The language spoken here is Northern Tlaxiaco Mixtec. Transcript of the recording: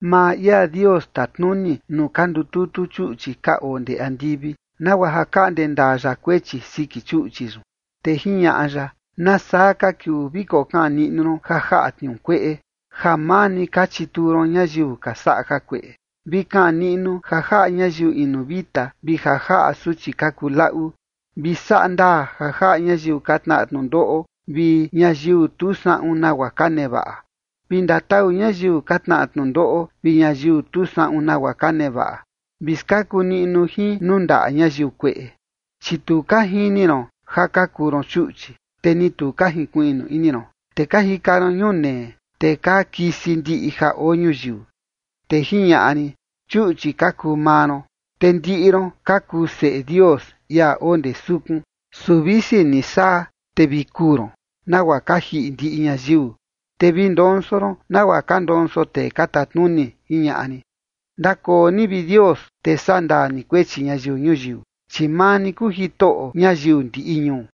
Maa ia Dios tatnuni nuu ka ndututu chuꞌchi ka oo ndee andivi, nagua ja kaꞌnde ndaa ya kuechi siki chuꞌchi yun. Te jiñaꞌa ya: “¿Nasaa ka kiuu vi kokaꞌan niꞌnu ron ja jaꞌa tniuu kueꞌe, ja maa ni ka chituu ron ñayiu ka saꞌa jakueꞌe? Vi kaꞌan niꞌnu ja jaꞌa ñayiu inu vita vi ja jaꞌa suchi ka kuu laꞌu. Vi saꞌa ndaa ja jaꞌa ñayiu ka tnaꞌa tnundoꞌo vi ñayiu tu saꞌun nagua ka nevaꞌa. Vi ndatau ñayiu ka tnaꞌa tnundoꞌo vi ñayiu tu saꞌun nagua ka nevaꞌa. Vi skaku niꞌnu jin nuu ndaꞌa ñayiu kueꞌe. ’Chi tu ka jini ron ja ka kuu ron chuꞌchi, te ni tu ka jinkuiꞌnu ini ron, te ka jika ron ñunee, te ka kisi ndiꞌi ja oo ñuyiu.” Te jiñaꞌa rin: “Chuꞌchi ka kuu maa ron, te ndiꞌi ron ka kuu seꞌe Dios, ia oo ndee sukun. Su visi ni saa, te vi kuu ron, nagua ka jiꞌi ndiꞌi ñayiu, te vi ndonso ron nagua ka ndonso tee ka tatnuni”, jiñaꞌa rin. Ndakoo ni, vi Dios, te sandaa ni kuechi ñayiu ñuyiu, chi maa ni kuu Jitoꞌo ñayiu ndiꞌi ñuu.